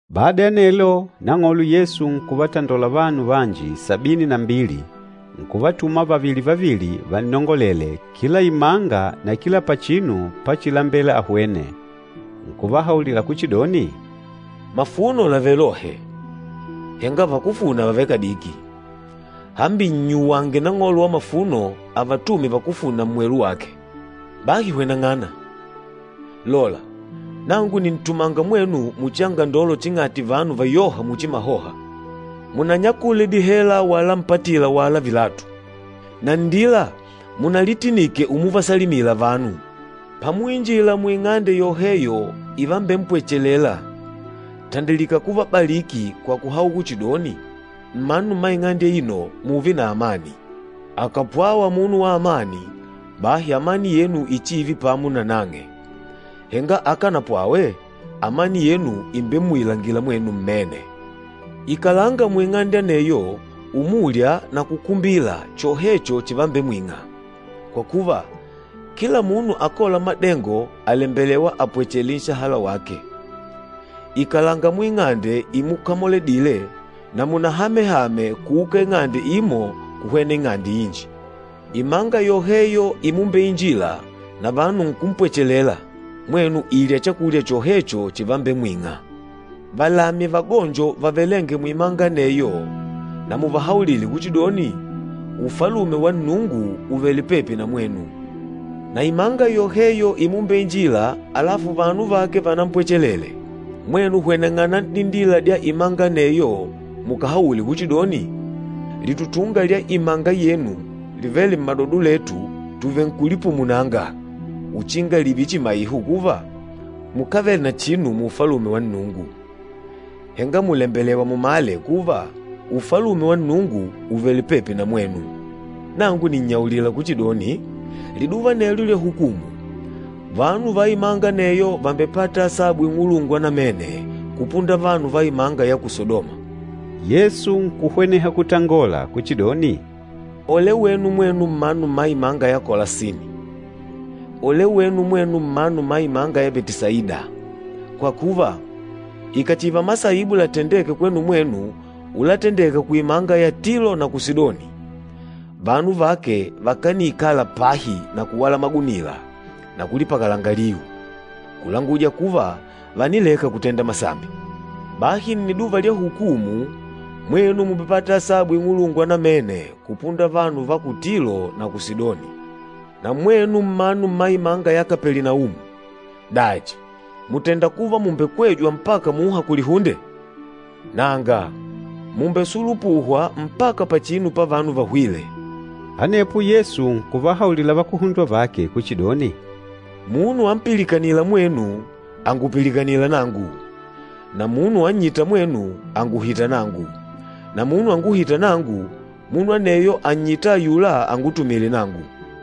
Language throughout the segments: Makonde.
Bada ya anelo, Nang'olo Yesu nkuvatandola vanu vanji sabini na mbili nkuvatuma vavili-vavili vannongolele kila imanga na kila pachinu pachilambela ahwene. Nkuvahaulila kuchidoni, “Mafuno làvele lohe, henga vakúfuna vàvele kadiki. Hambi, nnyuwange Nang'olo wa mafuno avatume vakúfuna mmwelu wake. Bahi hweneng'ana! Lola, nangu nìntumanga mwenu muchi angandolo ching'ati vanu vayôha muchi mahoha. Munanyakule dihela wala mpatila wala vilatu. Na nndila munalitinike umuvasalimila vanu. Pamuinjila muing'ande yoheyo ivambempwechelela, tandilika kuvabaliki kwa kuhaula kuchidoni, ‘Mmanu mma ing'ande aino mùùve na amani!’ Akàpwawa munu wa amani, bahi amani yenu ichiive pamo nanang'e, henga akànapwawe, amani yenu ìmbemmuilanga mwenu mmene. Ikalanga muing'ande aneyo, umulya na kukumbila chohecho chivambemwing'a, kwa kuva, kila munu akôla madengo àlembelewa apwechele nshahala wake. Ikalanga muing'ande imukamoledile, na munahame-hame kuuka ing'ande imo kuhwena ing'ande inji. Imanga yoheyo imumbeinjila na vanu nkumpwachelela, mwenu ilya chakulya chohecho chivambemwing'a. Valamye vagonjo vavelênge muimanga aneyo na muvahaulile kuchidoni, ‘Ufalume wa Nnungu ùvele pepi na mwenu.’ Na imanga yoheyo imumbeinjila alafu vanu vake vanampwachelele, mwenu hweneng'ana n'dindila dya imanga aneyo mukahaule kuchidoni, ‘Litutunga lya imanga yenu livêle mmadodo letu tuvenkulipumunanga uchinga lììve chimaiho kuva, mukávele na chinu mu Ufalume wa Nnungu. Henga mùlembelewa mumale kuva, Ufalume wa Nnungu ùvele pepi na mwenu!’ Nangu nìnnyaulila kuchidoni, liduva anelyo lya hukumu, vanu va imanga aneyo vàmbepata asabu ing'ulungwa namene kupunda vanu va imanga ya ku Sadoma.” Yesu nkuhweneha kutangola kuchidoni, “Ole wenu mwenu mmanu mma imanga ya Kolasini! Ole wenu mwenu mmanu mma imanga ya Betisaida! Kwa kuva, ikàchiva masaibu latendêke kwenu mwenu ulatendeka kuimanga ya Tilo na ku Sidoni, vanu vake vakaniikala pahi na kuwala magunila na kulipakalanga liu, kulanguja kuva vànileka kutenda masambi. Bahi nniduva lya hukumu, mwenu mùmbepata asabu ing'ulungwa namene kupunda vanu va ku Tilo na ku Sidoni. Na mwenu mmanu mma imanga ya Kapelinaumu, dachi mùtenda kuva mùmbekwejwa mpaka muha kulihunde? Nanga! Mùmbesulupuhwa mpaka pachinu pavanu vahwîle!” Anepo Yesu nkuvahaulila vakuhundwa vake kuchidoni, “Munu ampilikanîla mwenu, àngupilikanila nangu, na munu annyîta mwenu, ànguhita nangu. Na munu anguhîta nangu, munu aneyo ànnyita ayula angutumîle nangu.”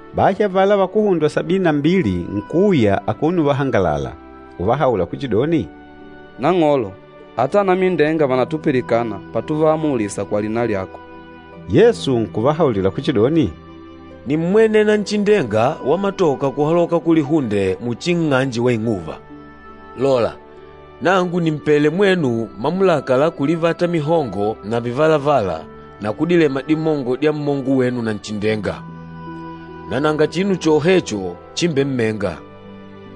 Bahi avala vakuhundwa sabini na mbili nkuuya akuno uvahangalala, uvahaula kuchidoni, “Nang'olo, ata anamindenga vànatupilikana patuvaamulisa kwa lina lyako.” Yesu nkuvahaulila kuchidoni, “Nímmwene Nanchindenga wamatoka kuhaloka kulihunde muchi nng'anje wa ing'uva. Lola, nangu nìmpele mwenu mamulaka la kulivata mihongo na vivalavala na kudilema dimongo dya mmongo wenu Nanchindenga, na nanga chinu chohecho chimbemmenga.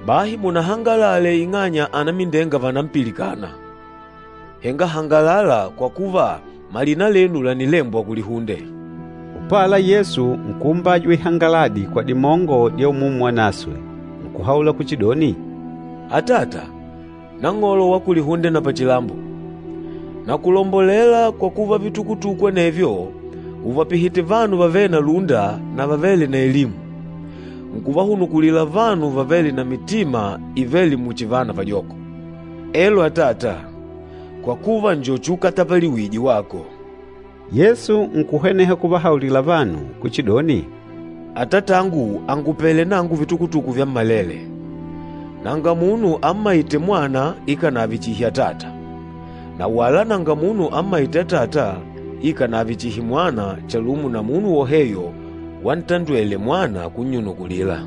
Bahi munahangalale ing'anya anamindenga vànampilikana, henga hangalala kwa kuva, malina lenu lànilembwa kulihunde.” Upala, Yesu nkuumbajwa ihangaladi kwa dimongo dya Umumu Wanaswe, nkuhaula kuchidoni, “Atata, Nang'olo wa kulihunde na pachilambo, nakulombolela kwa kuva vitukutuku anevyo ùvapihite vanu vavêle na lúnda na vavêle na elimu, nkuvahunukulila vanu vavêle na mitima ivêle muchi vana vajoko. Elo Atata, kwa kuva, njo chiukatapaliwije wako.” Yesu nkuhweneha kuvahaulila vanu kuchidoni, “Atatangu àngupele nangu vitukutuku vyammalele. Nanga munu ammaîte Mwana ikànave chihi Atata, na wala nanga munu ammaîte Atata ikànave chihi Mwana chalumo na munu woheyo wanatandwele Mwana kunnyunukulila.”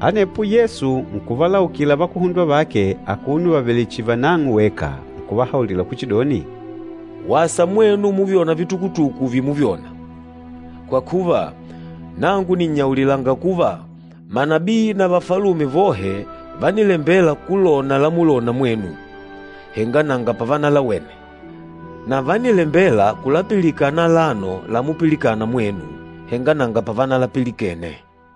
Anepo Yesu nkuvalaukila vakuhundwa vake akuno vavèlè chihi vanang'o weka nkuvahaulila kuchidoni, “Wasa mwenu muvyôna vitukutuku vimuvyona. Kwa kuva, nangu nìnnyaulilanga kuva, manabii na vafalume vohe vánilembela kulona lamulona mwenu, henga nanga pavanalawene, na vánilembela kulapilikana alano lamupilikana mwenu, henga nanga pavanalapilikene.”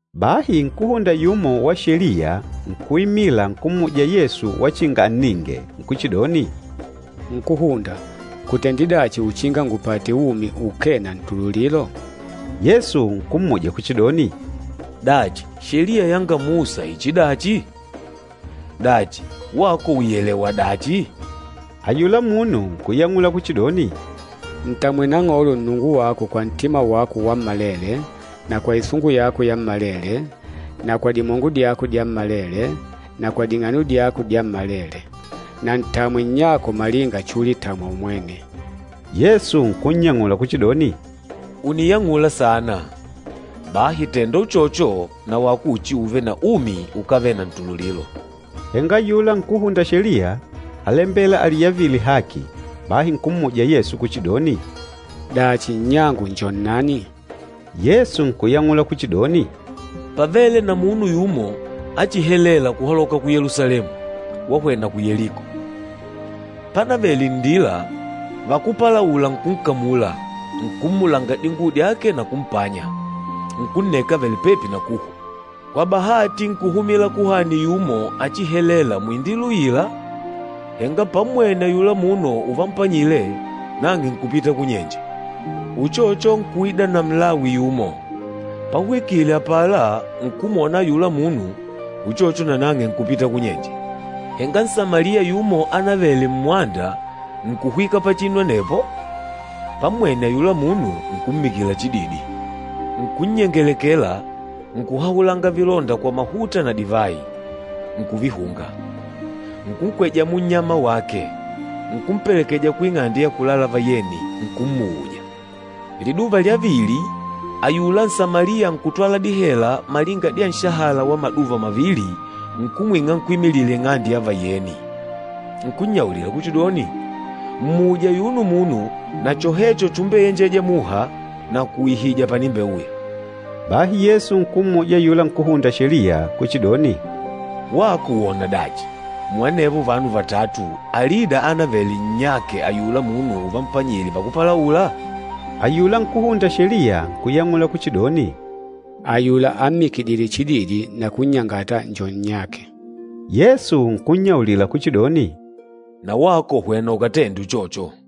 Bahi nkúhunda yumo wa Sheliya nkuimila nkummuja Yesu wachinga anninge, nkuchidoni, “Nkúhunda, ngutende dachi uchinga ngupate umi ukee na ntululilo?” Yesu nkummuja kuchidoni, “Dachi, Sheliya yanga Musa ichidachi? Dachi, wako ùiyelewa dachi?” Ayula munu nkuyang'ula kuchidoni, “Ntamwe Nang'olo Nnungu wako kwa ntima wako wammalele, na kwa isungu yako yammalele, na kwa dimongo dyako dyammalele, na kwa ding'ano dyako dyammalele. Na ntamwe nnyako malinga chulitamwa umwene.” Yesu nkunyang'ula kuchidoni, “Ùniyang'ula saana, bahi tènda uchocho nawako uchiuve na umi ukávele na ntululilo.” Henga ayula nkúhunda Sheliya álembela aliyavile haki, bahi nkummuja Yesu kuchidoni, “Dachi, nnyangu njo nnani?” Yesu nkuyang'ula kuchidoni, “Pávele na munu yumo achihelela kuhaloka ku Yelusalemu wahwena ku Yeliko. Pánavèlè nndila, vakúpalaula nkunkamula, nkummulanga dinguwo dyake na kumpanya, nkunneka avèlè pepi na kuhwa. Kwa bahati nkuhumila kuhani yumo achihelela muindila uila, henga pammwene ayula munu uvampanyile, nang'e nkupita kunyenje. Uchocho nkuida na Mlawi yumo, pahwikile apala nkumwona ayula munu, uchocho nanang'e nkupita kunyenje. Henga Nsamaliya yumo ánavele mmwanda, nkuhwika pachinu anepo, pammwene ayula munu nkummikila chididi. Nkunnyengelekela, nkuhahulanga vilonda kwa mahuta na divayi, nkuvihunga. Nkunkweja munnyama wake, nkumpelekeja kuing'ande ya kulala vayeni, nkummuuja. Liduva lya vili, ayula Nsamaliya nkutwala dihela malinga dya nshahala wa maduva mavili nkumwing'a nkwímilila ing'ande ya vayeni. Nkunnyaulila kuchidoni, ‘Mmuuje ayuno munu, na chohecho chumbeyenjeja muha, nakuuihija panimbeuya.’” Bahi Yesu nkummuja ayula nkúhunda Sheliya kuchidoni, “Wako wona dachi, muanevo vanu vatatu, alida ánavele nnyake ayula munu uvampanyile vakúpalaula?” Ayula nkúhunda Sheliya nkuyang'ula kuchidoni, “Ayula ammikidîle chididi na kunnyangata njo nnyake.” Yesu nkunnyaulila kuchidoni, “Na wako hwena ukatende uchocho.”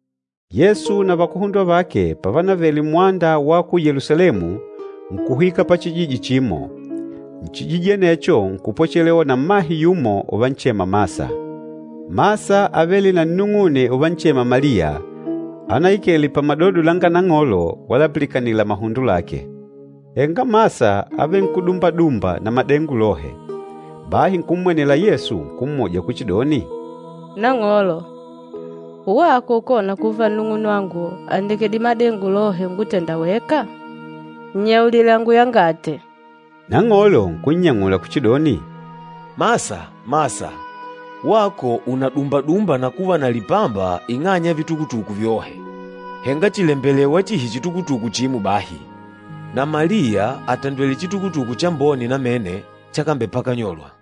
Yesu na vakuhundwa vake pavanavele mmwanda wa ku Yelusalemu, nkuhwika pachijiji chimo. Nchijiji anecho nkupwechelewa na mmahe yumo uvanchema Masa. Masa ávele na nnung'une uvanchema Maliya, anaikele pamadodo langa Nang'olo walapilikanila mahundo lake. Henga Masa ávenkudumba-dumba na madengo lohe. Bahi nkummwenele Yesu nkummuja kuchidoni, “Nang'olo, wako ukona kuva nnung'unwangu àndekedile madengo lohe ungutenda weka? Nnyaulile anguyangate.” Nang'olo nkunnyang'ula kuchidoni, “Masa, Masa, wako ùnadumba-dumba na kuva na lipamba ing'anya ya vitukutuku vyohe. Henga chìlembelewa chihi chitukutuku chimo bahi. Na Maliya àtandwele chitukutuku chambone namene chakambepakanyolwa.”